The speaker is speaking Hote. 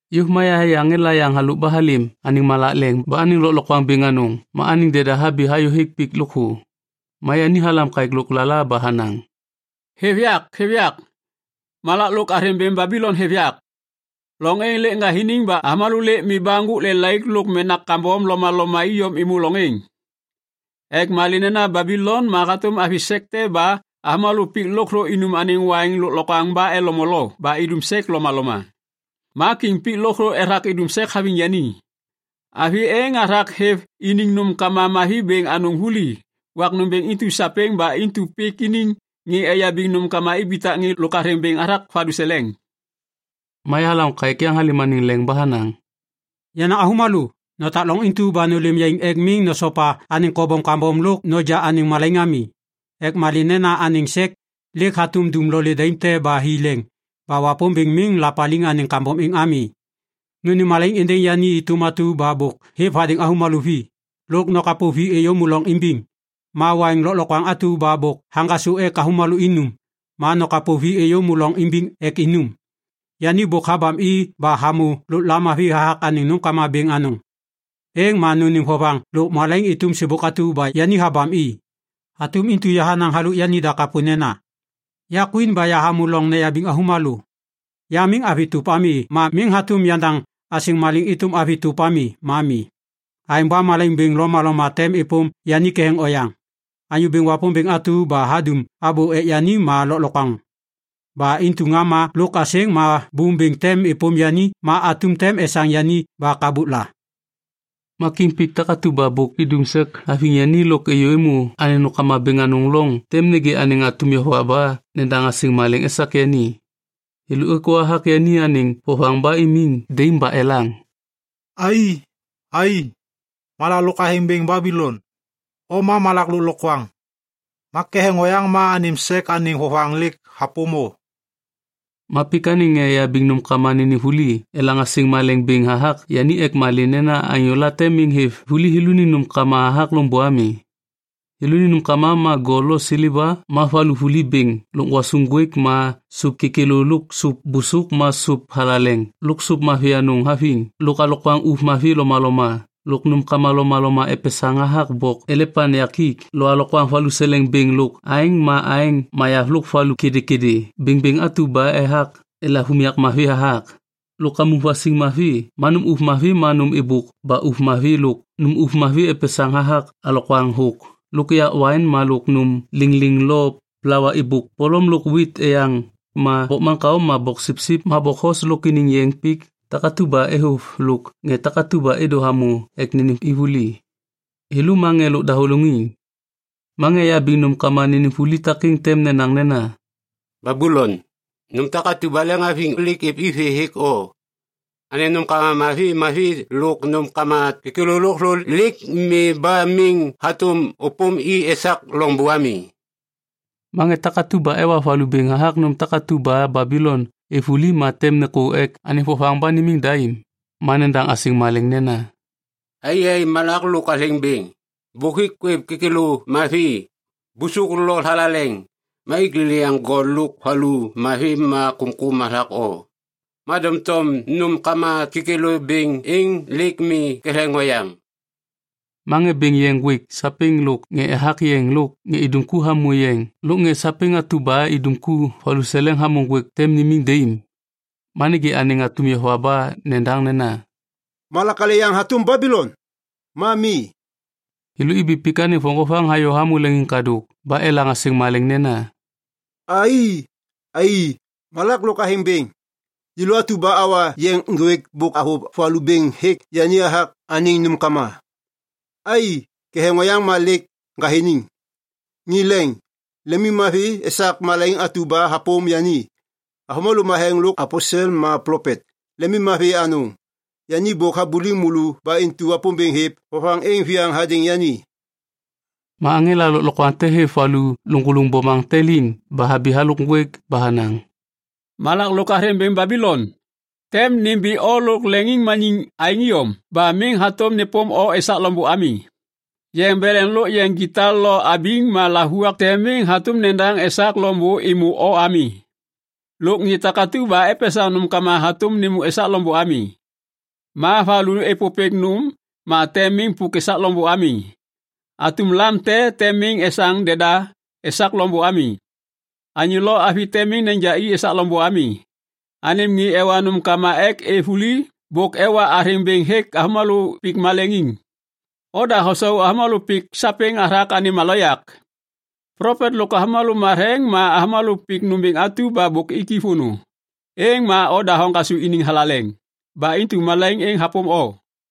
Yôv ma yahayê aŋela yaŋ halôk ba halêm anêŋ malak leŋ ba anêŋ lôklokwaŋ bêŋ anôŋ ma anêŋ deda habi hayôhêk pik lôkthô. Ma yani halam kaêk lôklala ba hanaŋ, “Hêv yak, hêv yak, malak lôk athêŋ bêŋ Babilon hêv yak. Loŋ êŋ lêk ŋgathiniŋ ba avômalô lêk mi ba ŋgôk lelaik lôk menak kambom lomaloma iyom êmô loŋ êŋ. Ek malê nena Babilon ma hatôm avi sek te ba avômalô pik lôkthô inum anêŋ waiŋ lôklokwaŋ ba elo molo ba idum sek lomaloma. Ma kiŋ pik lôkthô ethak idum sek haviŋ yani. Avi êŋ hathak hêv iniŋ nômkama mavi bêŋ anôŋ vuli wak nômbêŋ intu sapêŋ ba intu pik iniŋ ŋê eyabiŋ nômkama ibitak ŋê lôk athêŋ bêŋ hathak valuseleŋ.” Ma yahalaŋô kaêk yaŋ halêm anêŋ leŋ ba hanaŋ, “Yenaŋ avômalô, notak loŋ intu ma nôlêm yaiŋ ek miŋ nosopa anêŋ kobom kambom lôk noja anêŋ malaiŋ ami. Ek malê nena anêŋ sek lêk hatôm dumlolê daim te ba hi leŋ ba Wapômbêŋ miŋ lapaliŋ anêŋ kambom êŋ ami. Nônêm malaiŋ êndêŋ yani êtôm atu ba bôk hêv hadêŋ avômalô vi, lôk nokapo vi êyômô loŋ imbiŋ. Ma waiŋ lôklokwaŋ atu ba bôk haŋgasô ek avômalô inum, ma nokapo vi êyômô loŋ imbiŋ ek inum. Yani bôk habam i ba hamô lôk lamavi hathak anêŋ nômkama bêŋ anôŋ, êŋ ma nônêm vovaŋ lôk malaiŋ êtôm sêbôk atu ba yani habam i. Hatôm intu hanaŋ halôk yanida kapô nena, ‘Ya kwin ba yahamô loŋ neyabiŋ avômalô. Ya miŋ avi tôp ami ma miŋ hatôm yandaŋ asêŋ malêŋ êtôm avi tôp ami ma mi.’ Aêŋ ba malaiŋ bêŋ lomaloma tem êpôm yani ketheŋ oyaŋ. Anyô Bêŋ Wapômbêŋ atu ba hadum abô ek yani ma lôklokwaŋ. Ba intu ŋama lôk asêŋ ma bôm bêŋ tem êpôm yani ma atum tem esaŋ yani ba kabukla.” “Ma kiŋ pik takatu ba bôk idum sek haviŋ yani lôk êyô êmô anêŋ nômkama bêŋ anôŋ loŋ tem nêgê anêŋ atum yova ba nedaŋ asêŋ malêŋ esak yani. Thêlô êkô hathak yani anêŋ vovaŋ ba imiŋ daim ba elaŋ, “‘Ai, ai, malak lôk athêŋ bêŋ Babilon, o ma malak lôklokwaŋ. Ma ketheŋ oyaŋ ma anêm sek anêŋ vovaŋ lêk hapôm o.’ “Ma pik anêŋ ŋê eyabiŋ nômkama nênêm vuli elaŋ asêŋ malêŋ bêŋ hathak yani ek malê nena anyô late miŋ hêv vuli thêlôniŋ nômkama hathak loŋbô ami. Thêlôniŋ nômkama ma gol lo seleva ma valu vuli bêŋ lôk gwasuŋ ŋgwêk ma sôp kêkêlô lôk sôp bôsôk ma sôp thalaleŋ lôk sôp mavi anôŋ haviŋ lôk alokwaŋ ôv mavi lomaloma lôk nômkama lomaloma epesaŋ hathak bok elepaŋ yakik lo alokwaŋ valuseleŋ bêŋ lôk aeŋ ma aeŋ mayav lôk valu kêdêkêdê bêŋbêŋ atu ba ethak elav unyak mavi hathak lôk kamuŋ vasiŋ mavi ma nôm ôv mavi ma nôm êbôk ba ôv mavi lôk nôm ôv mavi epesaŋ hathak alokwaŋ thôk lôk yak waiŋ lôk nôm lêŋlêŋ lo plawa êbôk polom lôk wit eyaŋ ma bokmaŋkao ma boksipsip ma bokhos lôk iniŋ yeŋ pik takatu ba êvôv lôk ŋê takatu ba êdô hamô ek nênêm i vuli, thêlô ma ŋê lôk dahôlôŋiŋ. “Ma ŋê eyabiŋ nômkama nênêm vuli takêŋ tem nenaŋ nena, ‘Babilon, nôm takatu ba lemhaviŋ lêk êv i vê hêk o. Anêm nômkama mavi mavi lôk nômkama kêkêlô lôkthô lêk mi ba miŋ hatôm ôpôm i esak loŋbô ami.’ “Ma ŋê takatu ba ewa valu bêŋ hathak nômkama takatu ba Babilon êv vuli ma tem nêkô ek anêŋ vovaŋ ba nimiŋ daim ma nedaŋ asêŋ malêŋ nena, “‘Ai, ai, malak lôk athêŋ bêŋ, bôk ik kwêv kêkêlô mavi, bôsôk lo thalaleŋ, ma ik lêlêyaŋ gol lôk valu mavi ma kômkôm hathak o, ma doŋtom nômkama kêkêlô bêŋ êŋ lêk mi ketheŋ oyaŋ!’ “Ma ŋê bêŋ yeŋ ŋgwêk sapêŋ lôk ŋê ethak yeŋ lôk ŋê idum ku hamô yeŋ lôk ŋê sapêŋ atu ba idum ku valuseleŋ hamô ŋgwêk tem nimiŋ daim. Ma nêgê anêŋ atum yova ba nedaŋ nena, ‘Malak alê yaŋ hatôm Babilon? Ma mi.’ Thêlô ibi pik anêŋ voŋgovaŋ hayô hamô leŋiŋkadôk ba elaŋ asêŋ malêŋ nena, “‘Ai, ai malak lôk athêŋ bêŋ. Yêlô atu ba awa yeŋ ŋgwêk bôk avôv valu bêŋ hêk yani hathak anêŋ nômkama. Ai, ketheŋ oyaŋ ma lêk ŋgathiniŋ.’ Ŋê leŋ, lemimmavi esak malaiŋ atu ba hapôm yani! Avômalô matheŋ lôk aposel ma plopet, lemimmavi anôŋ. Yani bôk habuliŋ môlô ba intu Wapômbêŋ hêv vovaŋ êŋ viyaŋ hadêŋ yani.” Ma aŋela lôklokwaŋ te hêv valu lôŋgôlôŋ bomaŋ te liŋ ba habi halôk ŋgwêk ba hanaŋ, “Malak lôk athêŋ bêŋ Babilon, tem nimbi o lôk leŋiŋmaniŋ aêŋ iyom ba miŋ hatôm nêpôm o esak loŋbô ami. Yeŋ beleŋ lôk yeŋ gita lo abiŋ ma lavuak tem miŋ hatôm nedaŋ esak loŋbô êmô o ami. Lôk ŋê takatu ba epesaŋ nômkama hatôm nêmô esak loŋbô ami. Ma valu êpôpêk nôm ma tem miŋ pôk esak loŋbô ami. Atum lam te tem miŋ esaŋ deda esak loŋbô ami. Anyô lo avi tem miŋ neja i esak loŋbô ami. Anêm ŋê ewa nômkama ek êv vuli bôk ewa athêŋ bêŋ hêk avômalô pik maleŋiŋ. Oda hosau avômalô pik sapêŋ hathak anêm aloyak. Plopet lôk avômalô matheŋ ma avômalô pik nômbêŋ atu ba bôk ik vônô, êŋ ma oda hoŋgasô iniŋ thalaleŋ. Ba intu malaiŋ êŋ hapôm o.”